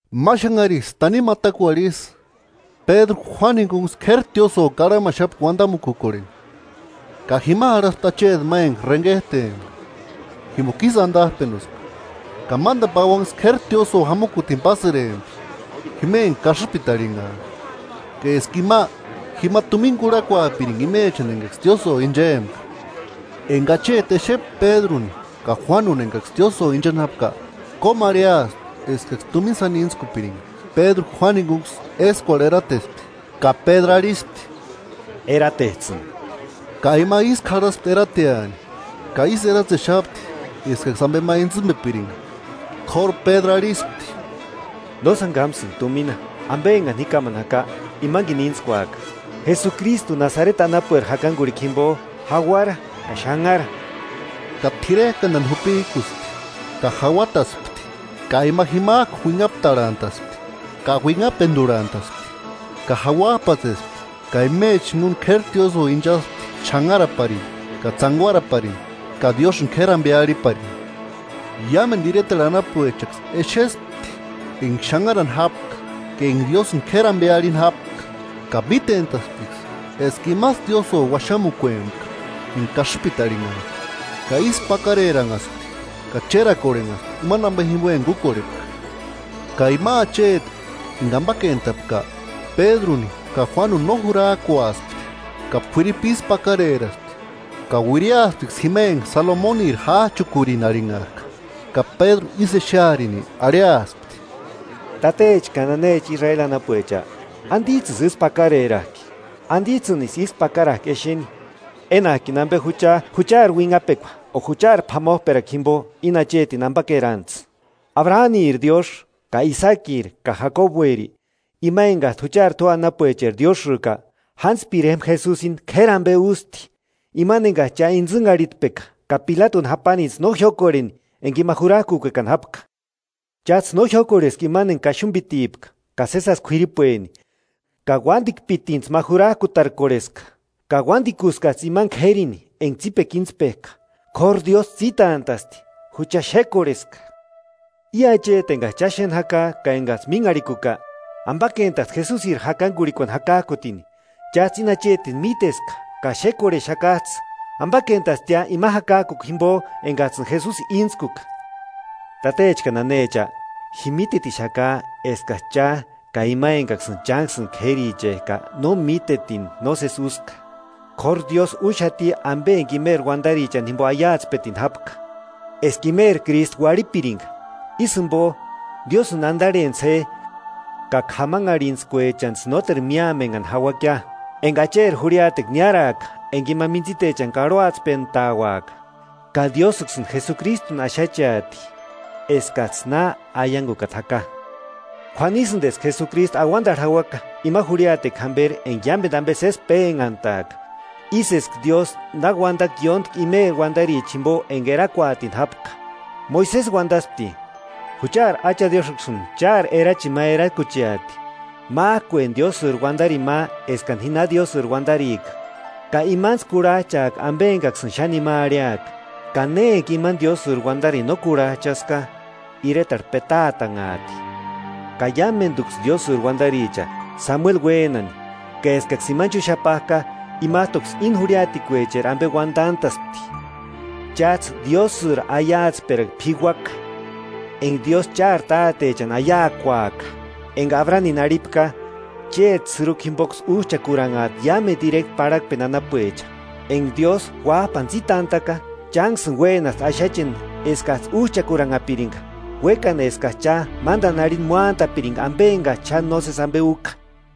Ma xanhariksï tanimu atakuarhu ísï, Pédru Juánu jinkuniksï k'éri tiósïo karhamaxapti uantamukukorheni. Ka jima járhaspti acheti ma enka renket'empka jimpoka ísï antap'enuspka, ka mántani pauanksï k'éri tiósïo jamukutini pásïrempti, jima enka kasïpiti arhinhak'a, ka eska ima jima tumina kurhakuaapirinka imechani enkaksï tiósïo inchempka. Enka acheti xépka Pédruni ka Juánuni enkaksï tiósïo inchani jápka, kómu arhiaspti eskaksï tumina sáni íntskupirinka. Ka Pédru arhispti Juánu jinkunksï éskuarhu eratespti ka arhispti: –Eratets'ïni. Ka ima ísku jarhasti erateani ka ísï eratsexapti eskaksï ampe intsïmpepirinka. K'óru Pédru arhispti: –No sáni kámasïnka tumina, ampe enkani ji kámani jaka, imankini íntskuaka: Jesukristu Nasareti anapueri jakankurhikua jimpo jauara ka xanhara. Ka t'irek'antani jupik'uspti ka jauataspti ka ima jimak'u uinhaptarhantaspti ka uinhapenturhantaspti; ka jauap'atsespti ka imechani jinkuni k'éri tiósïo inchaspti xanharaparini ka tsánkuaraparini ka Diósïni k'éri ampe arhiparini. Iámentu iretarhu anapuechaksï exespti enka xanharani jápka ka enka Diósïni k'éri ampe arhini jápka. Ka mítent'asptiksï eska imasï tiósïo uaxamukuempka enka kasïpiti arhinhak'a, ka ísku pakareranhaspti ka chérakorhenhaspti imani ampe jimpo enka úkorhepka. Ka ima acheti enka ampakentapka, Pédruni ka Juánuni no jurak'uaspti, ka k'uiripu ísku pakareraspti ka uiriasptiksï jima enka Salomoniri jách'ukurini arhinhak'a. Ka Pédru ísï exearini arhiaspti: “Tatecha ka nanecha Israeli anapuecha, ¿Antits'ïsï ísku pakarerak'i? ¿Antits'ïnisï ísku pakarak'i exeni? Enak'ini ampe jucha juchari uinhapekua o juchari p'amop'erakua jimpo íni achetini ampakerantsï. Abraniri Diósï ka Isakiri ka Jakobueri, ima enkat'u juchari tua anapuecheri Diósïka, jántspiri jémpa Jesusini k'éri ampe ústi; imani enkats'ï cha intsïnharhitpeka ka Pilatuni jáparinits'ï no jiókorheni enka ima jurak'ukuekani jápka. Cháts'ï no jiók'orheska imani enka Kaxumpitipka ka sési jásï k'uiripueni, ka uantikpitintsï ma jurak'utarkorheska. Ka uántikuskats'ï imani k'érini enka tsípekua íntspek'a, k'óru Diósï tsítant'a'sti, jucha xékorheska. I acheti enkats'ï cha xéni jaka ka enkats'ï mínharhikuka, ampakentasti Jesusiri jakankurhikuani jakak'utini; cháts'ï íni achetini míteska ka xékorhexakats'ï. Ampakentastia ima jakak'ukua jimpo enkats'ïni Jesusi íntskuka.” “Tatecha ka nanecha, ji mítetixaka eskats'ï cha ka ima enkaksïni chánksïni k'érichek'a no mítetini nósesi úska. K'óru Diósï úxati ampe enka imeri uantarichani jimpo aiatspetini jápka: Eska imeri Krístu uarhipirinka. Ísï jimpo, Diósïni antarhentsï je ka k'amanharhintskuechantsï nóteru míamenhani jauakia [enka Acheri jurhiatekua niáraaka enka ima mintsitechani karhuantspeantauaka.] Ka Diósïksïni Jesukristuni axacheati eskats'ï na aiankukata jaka. K'uanisïnti eska Jesukristu auantarhu jauaka ima jurhiatekua jamperi enka iámentu ampe sési pénhantaaka, ísï eska Diósï na uantaka ióntki imeri uantarichani jimpo enka erakuatini jápka. Moisesi uantaspti: ‘Juchari Acha Diósïksïni chári erachini ma erakucheati, mák'ueni Diósïri uantarini ma eskani ji na Diósïri uantarika; ka imantsï kurhach'aaka ampe enkaksïni xáni ima arhiaka. Ka ne enka imani Diósïri uantarini no kurhach'aska, iretarhu petaatanhaati.’ Ka iámentuksï Diósïri uantaricha, Samueli uénani ka eskaksï imani chúxapak'a, imat'uksï íni jurhiatecheri ampe uantant'a'spti. Cháts'ï Diósïri aiatsperakua p'ikuaka enka Diósï chári tátechani aiakuaka, enka Abranini arhipka: ‘Chéti sïrukua jimpoksï úch'akuranhaati iámentu ireta parhakpeni anapuecha.’ Enka Diósï Uáp'ani tsítant'a'ka, chánksïni uénaspti axacheni eskats'ïni úch'aranhapirinka, uékani eskats'ï cha mántani arhini móantapirinka ampe enkats'ï xáni nósesi ampe úka.”